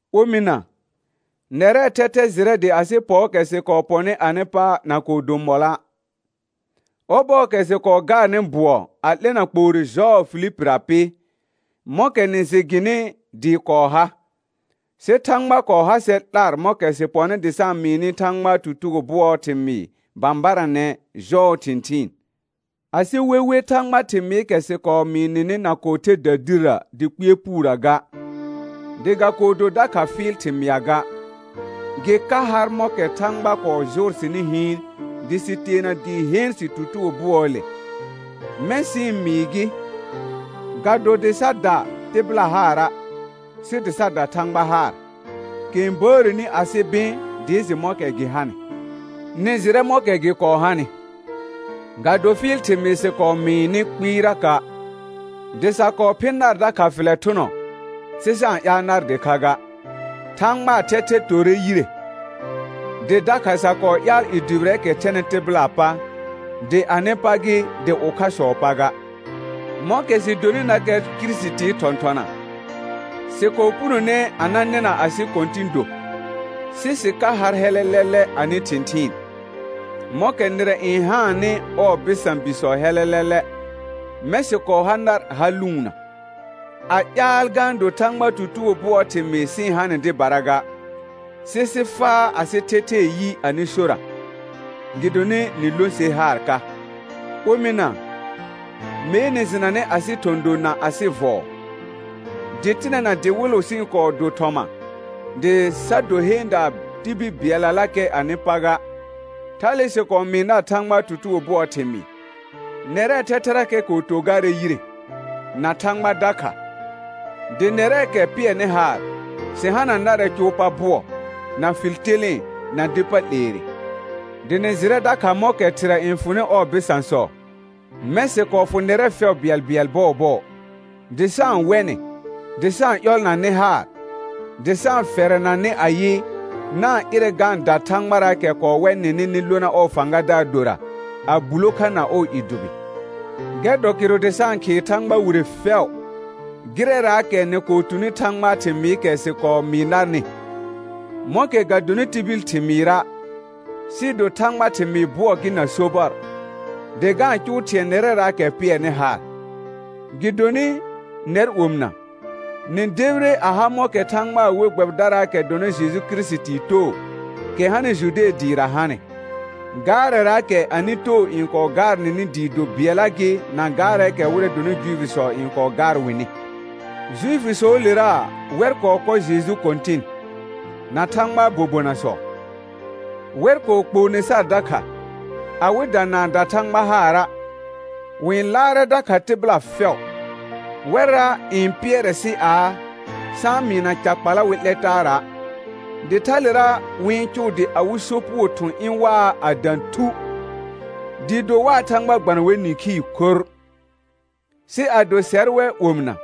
Omɩna, nɛrɛɛ thɛthɛ jɩrɛ dɩ asɩ pɔɔkɛ sɩ kɔɔ pɔnɩ anɩ pa na kɔɔ do mɔlɔa'. Ɔbɔɔkɛ sɩ kɔɔ gaarnɩ bʋɔ a 'lɛna kpoore jɔɔ Filipira pɩ, mɔ̃kɛ nɩ jɩ gɩnɩ dɩɩ kɔɔ ha, sɩ Thãgba kɔɔ ha sɛr 'lar mɔ̃kɛ sɩ pɔnɩ dɩ sa-n mɩɩ nɩ Thãgbaa tutugo bʋɔɔ thɩmɩɩ bãbaranɛ jɔɔ thɩ̃thɩɩn. Asɩ wewe Thãgba thɩmɩɩkɛ sɩ kɔɔ mɩɩ nɩnɩ na kɔɔ the dədirrə dɩ kpɩɛr puurə ga, dɩ ga kɔɔ do dakha fɩɩl thɩmɩa ga. Gɩ ka har mɔ̃kɛ Thãgba kɔɔ jʋʋr sɩnɩ hɩɩn dɩ sɩ teena dɩ heen sɩ tutugo bʋɔɔle, mɛ̃ sɩ-n mɩɩ gɩ, ga do dɩ sa da tɩbɩla haara', sɩ dɩ sa da Thãgba haar, kɛ n bəəreni asɩ bɩ̃ dɩ jɩ mɔ̃kɛ gɩ hanɩ. Nɩ jɩrɛ mɔ̃kɛ gɩ kɔɔ hanɩ, ga do fɩɩl thɩmɩɩr sɩ kɔɔ mɩɩ nɩ kpɩɩraka', dɩ sa kɔɔ phɩ̃ nar dakha fɩlɛ thʋnɔ, sɩ sa-n ƴaal nar dɩkha ga, Thãgbaa thɛthɛ torre yire; dɩ dakha sa kɔɔ ƴaal i dʋbɩrɛɛkɛ thɛnɩ tɩbɩlaa pa, dɩ anɩ pa gɩ, dɩ ʋkhasɔɔ pa ga. Mɔ̃kɛ sɩ donɩnakɛ Kirisitii thɔ̃thɔna, sɩ kɔɔ punone a na nɩna asɩ kɔ̃tɩ̃ do, sɩ sɩ ka har hɛlɛlɛlɛ anɩ thɩ̃thɩɩn. Mɔ̃kɛ nɩrɛ n haannɩ ɔɔ bɩsã bisɔ hɛlɛlɛlɛ, mɛ̃ sɩ kɔɔ ha nar ha lʋʋnna, a ƴaal ga-n do Thãgbaa tutugo bʋɔɔ thɩmɩɩ sɩ-n ha nɩ dɩbara ga, sɩ sɩ faa asɩ thɛthɛɛ yi anɩ sora, gɩdonɩ nɩ lõ ser haar ka. Omɩna, mee nɩ jɩnanɛ asɩ thɔ̃ do na asɩ vɔɔ; dɩtɩnɛ na dɩwɩlʋ sɩ-n kɔɔ do thɔma dɩ sa do heendaa tibil bɩɛllalakɛ anɩ pa ga, thale sɩ kɔɔ mɩɩ nar Thãgbaa tutugo bʋɔɔ thɩmɩɩ. Nɛrɛɛ thɛthɛrakɛ kɔɔ to garɛ yire, na Thãgba dakha, dɩ nɛrɛɛkɛ pɩɛrnɩ haar, sɩ hana narɛ cʋʋ pa bʋɔ, na fɩl telẽe na dɩ pa 'leere. Dɩ nɩ jɩrɛ dakha mɔ̃kɛ thɩrɛ n fʋnɩ ɔɔ bɩsãsɔ, mɛ̃ sɩ kɔɔ fʋ nɛrɛ fɛʋ bɩɛlbɩɛl bɔɔbɔɔ, dɩ sa-n wɛ nɩ, dɩ sa-n ƴɔlna nɩ haar, dɩ sa-n fɛrɛna nɩ ayɩ: Na-n ɩrɛ ga-n da Thãgbaraakɛ kɔɔ wɛ nɩnɩ nɩ lona ɔɔ fãgadaar dora, a bulo kha na ɔɔ i dʋbɩ. Gɛr dɔ kɩrʋ dɩ sa-n khɩɩ Thãgba wire fɛʋ, gɩrɛraakɛ nɩ kɔɔ tuni Thãgbaa thɩmɩɩkɛ sɩ kɔɔ mɩɩ narnɩ, mɔ̃kɛ ga donɩ tibil thɩmɩɩra', sɩɩ do Thãgbaa thɩmɩɩ bʋɔ gɩ na sobɔr, dɩ ga-n cʋʋ thɩ̃ɛ nɛrɛraakɛ pɩɛrnɩ haar. Gɩdonɩ, nɛr omɩna, nɩ debire a ha mɔ̃kɛ Thãgbaa we gbɛbɩdaraakɛ dɔnɩ Jeju Kirisitii too, kɛ hanɩ Jude dɩɩra hanɩ, gaarɛraakɛ anɩ too n kɔɔ gaar nɩnɩ dɩɩ do bɩɛlla gɩ na gaarɛɛkɛ wɩrɛ dɔnɩ Juifisɔ n kɔɔ gaar wɩnɩ. Juifisɔɔlera wɛr kɔɔ kɔ Jeju Kɔ̃tɩn, na Thãgbaa bobonasɔ, wɛr kɔɔ kpoone sar dakha, awɩda na-n da Thãgba haara', wɩ-n laarɛ dakha tɩbɩla fɛʋ. Wɛrra n pɩɛrɛ sɩ aa, sa-n mɩɩna ca kpala wɩ 'lɛ taara', dɩ thalera wɩ-n cʋʋ dɩ awɩ sopugo thʋ̃ ɩ̃ waa a dã thu, dɩɩ do waa Thãgba gbana wɛr nĩkhii khorr. Sɩ ado sɛr wɛ omɩna,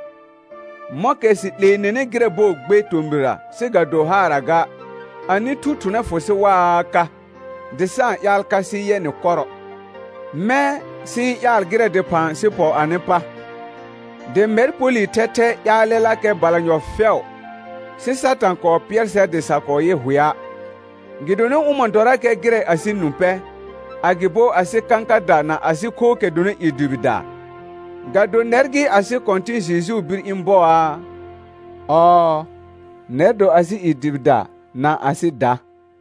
mɔ̃kɛ sɩ 'lee nɩnɩ gɩrɛ bɔɔ gbe tomɩrra sɩ ga do haarra ga, anɩ thu thʋnɛ fʋ sɩ waa ka, dɩ sa-n ƴaal ka sɩ yɛ nɩ kɔrɔ. Mɛ̃ sɩ-n ƴaal gɩrɛ dɩphã sɩ pɔ anɩ pa, dɩ mɛr Polɩ thɛthɛ ƴaalɛlakɛ balanyɔ fɛʋ, sɩ Satã kɔɔ pɩɛr sɛr dɩ sa kɔɔ yɩ hʋɛa'. Gɩdonɩ ʋmɔ̃ dɔrakɛ gɩrɛ asɩ nũ pɛ, agɩbo asɩ kãkada na asɩ khookɛ dɔnɩ i dʋbɩdaa, ga do nɛr gɩ asɩ Kɔ̃tɩ̃ Jejuu bir ɩ̃ bɔaa? Ɔɔ, nɛr dɔ asɩ i dʋbɩda na asɩ da.